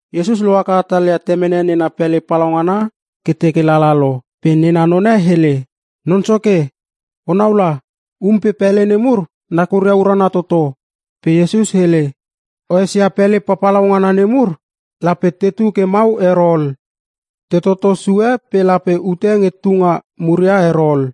Iesus lohaka hatalia temene nena pele palaungana ke teke lala lo pe nena none hele, “Non Soke, onau la. Um pe pele nemur nakuria urana toto!” Pe Iesus hele, “O esia pele papalau ngana nemur? Lape tetu ke mau ero ol. Te toto sue pe lape ute nge tunga muria ero ol.”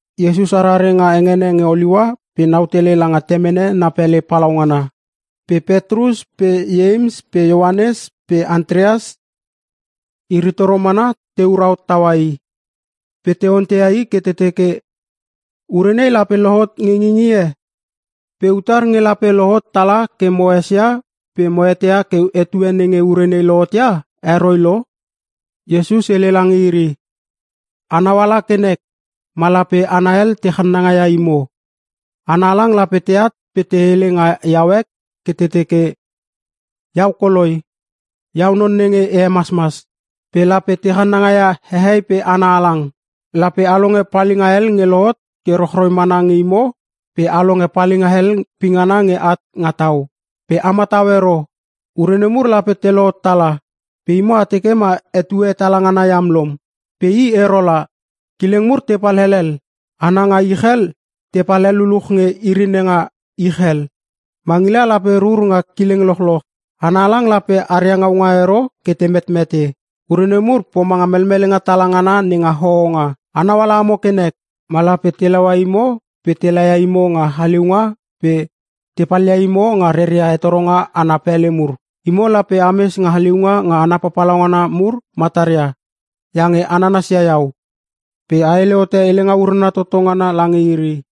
Iesus arare nga hengene nge Oliua pe nau tele langa temene na pele palaungana, pe Petrus pe Ieims pe Ioanes pe Antreas, iri toro mana teura hot tau i. Pe te onteia i ke te teke, “Ure nei lape lohot nge ngingie? Pe utar nge lape lohot tala ke mo esia pe mo eteia ke etue nenge ure nei lohotia heroi lo?” Iesus hele lange iri, “Anau ala ke nek ma lape hana hel te channanga ia imo. Hana halang lape teat pe te hele nga iau ek ke te teke, ‘Iau koloi! Iau non nenge e hemasmas!’ Pe lape te channanga ia hehei pe hana halang. Lape a longe palinga hel nge lohot ke rochroi mana nge imo pe a longe palinga hel pingana nge at nga tau. Pe a matau ero. Ure nemur lape te lohot tala pe imo a teke ma etue hetala ngana iam lom, pe i ero la. Kileng mur tepal helel. Hana nga ich hel tepal hel luluch nge iri nenga ich hel. Mangila lape rur nga kileng lochoch. Hana halang lape aria ngaunga ero ke te metmete. Ure nemur pomanga melmelenga tala ngana nenga hohonga. “Anau ala amo ke nek. Ma lape te laua imo pe te laia imo nga haliunga pe te palia imo nga reria hetoronga ana pele mur. Imo lape ames nga haliunga nga hana papalau ngana mur mataria iange a nanasia iau, pe a hele hote helenga urana toto ngana lange iri.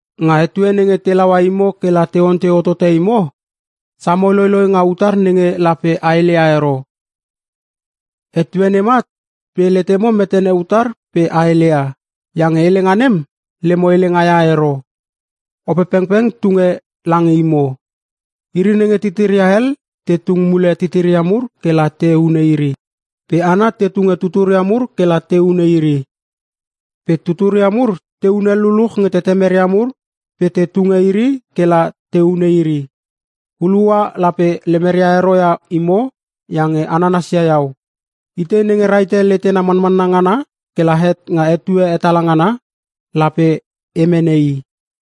Nga etue nenge te laua imo ke la te ontei hotote imo, samo loiloi nga utar nenge lape a heleia ero. Etue nem at pe letemo metene utar pe a heleia, iange helenga nem lemo helenga ia ero. Opepengpeng tunge lange imo. Iri nenge titiria hel te tung mule titiria mur ke la te hune iri. Pe hana te tunge tuturia mur kela te hune iri. Pe tuturia mur te hunel luluch nge tetemeria mur pe te tunge iri ke la te hune iri. Hulua lape lemeria ero ia imo iange a nanasia iau. Itei nenge rahite letena manmanna ngana kela het nga etue hetala ngana, lape e mene i.”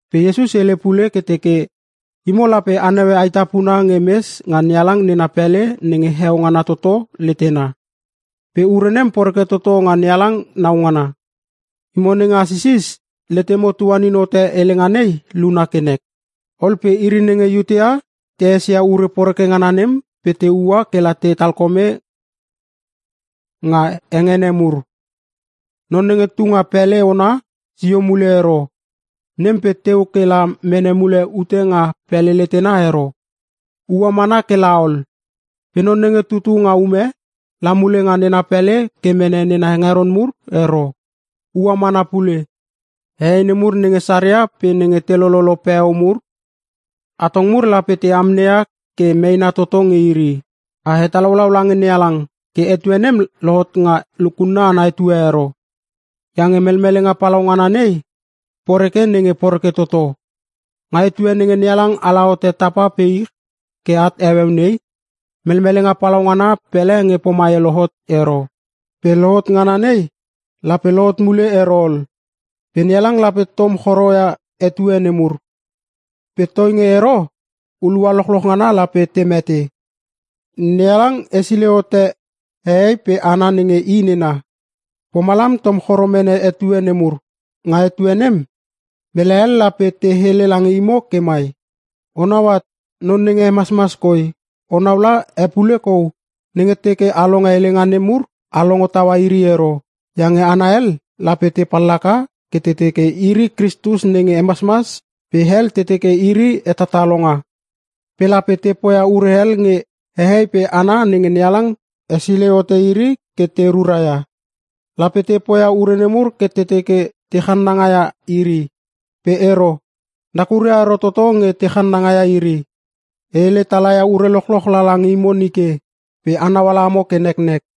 Pe Iesus hele pule ke teke, “Imo lape a naue aetapuna nge mes nga NeHalang nena pele nenge heo ngana toto letena. Pe ure nem poreke toto nga NeHalang nau ngana. (Imo nenge asisis, letemo tuanin hote helenga nei luna ke nek!). Ol pe iri nenge Iutea te esia ure poreke ngana nem pe te ua kela te talkome nga hengene mur. Non nenge tu nga pele ona, sio mule ero, nem pe teu ke la mene mule ute nga pele letena ero, ua mana ke la ol. Pe non nenge tutu nga ume, la mule nga nena pele ke mene nena hengeron mur ero, ua mana pule. Hehei nemur nenge saria pe nenge te lololo peo mur, atong mur lape te amneia ke meena toto nge iri! A hetalaulau lange NeHalang ke etue nem lohot nga lukunna ana etue ero iange melmelenga palau ngana nei poreke nenge poreke toto. Nga etue nenge NeHalang ala hote tapa pe ich ke at heueu nei, melmelenga palau ngana pele nge pomai lohot ero. Pe lohot ngana nei, lape lohot mule ero ol. Pe NeHalang lape tom choro ia etue nemur. Pe toinge ero, hulua lochloch ngana lape te mete. NeHalang hesilei hote hehei pe hana nenge i nena, pomalam tom choro mene etue nemur. “Nga etue nem, mele hel lape te hele lange imo ke mai, ‘O nau at, non nenge hemasmas koi! O nau la e pule kou!’ Nenge teke a longe helenga nem mur, a longo taua iri ero. Iange hana hel lape te pallaka ke te teke iri Kristus nenge hemasmas pe hel te teke iri hetatalonga. Pe lape te poia ure hel nge hehei pe hana nenge NeHalang hesilei hote iri ke te ruraia. Lape te poia ure nemur ke te teke te channanga ia iri. Pe ero, nakuria ero toto nge te channanga ia iri. E hele tala ia ure lochloch lala nge imo nike pe a nauala amo ke neknek!”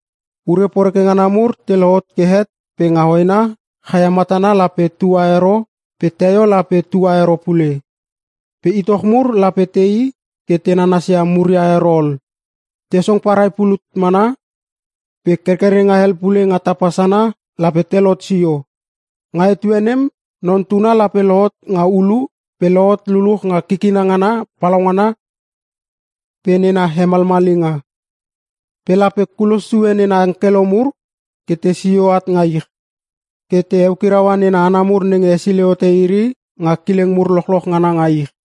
“Ure poreke ngana mur te lohot ke het pe nga hoena chaia matana lape tua ero pe teio lape tua ero pule. Pe itoch mur lape tei ke te nanasia muria ero ol, te song parai pulut mana pe kerkerenga hel pule nga tapa sana lape telot sio. Nga etue nem Non Tuna lape lohot nga ulu pe lohot luluch nga kikina ngana palaungana pe nena hemalmalinga. Pe lape kulos sue nena angkelo mur ke tesio at nga ich, ke te eukiraua nena hana mur nenge hesilei hote iri nga kileng mur lochloch ngana nga ich.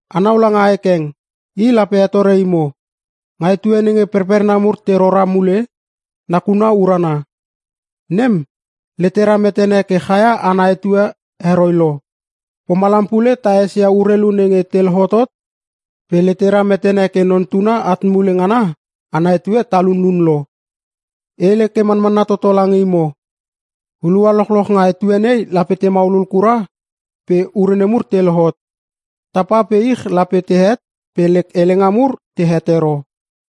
“Anau langa ae keng, i lape hetore imo. Nga etue nenge perperna mur te rora mule, nakuna urana. Nem, letera metene ke chaia ana etue heroi lo. Pomalam pule ta esia urelu nenge te lohotot pe letera metene ke Non Tuna at mule ngana ana etue talunun lo. E hele ke manmanna toto lange imo. Hulua lochloch nga etue nei lape te maulul kura pe ure nemur te lohot. Tapa pe ich lape tehet pe lek helenga mur tehet ero.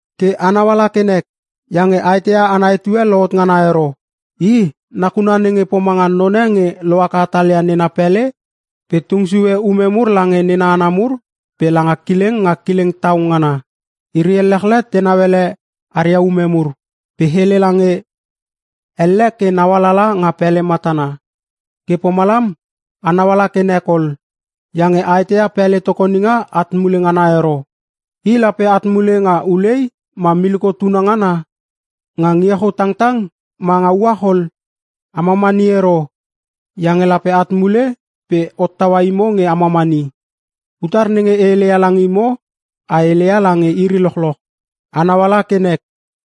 Ke a nauala ke nek, iange a eteia ana etue lohot ngana ero. I nakuna nenge pomanga none nge lohaka hatalia nena pele pe tung sue ume mur lange nena hana mur pe langa kileng nga kileng tau ngana. Iri ellechle tenau ele aria ume mur pe hele lange elle ke naualala nga pele matana. Ke pomalam a nauala ke nek ol, iange a eteia pele tokoninga at mule ngana ero. I lape at mule nga ulei ma miliko tuna ngana. Nga ngie chou tangtang ma nga uach ol. A mamani ero, iange lape at mule pe hottaua imo nge a mamani. Utar nenge e heleia lange imo, e heleia lange iri lochloch: Anau ala ke nek!”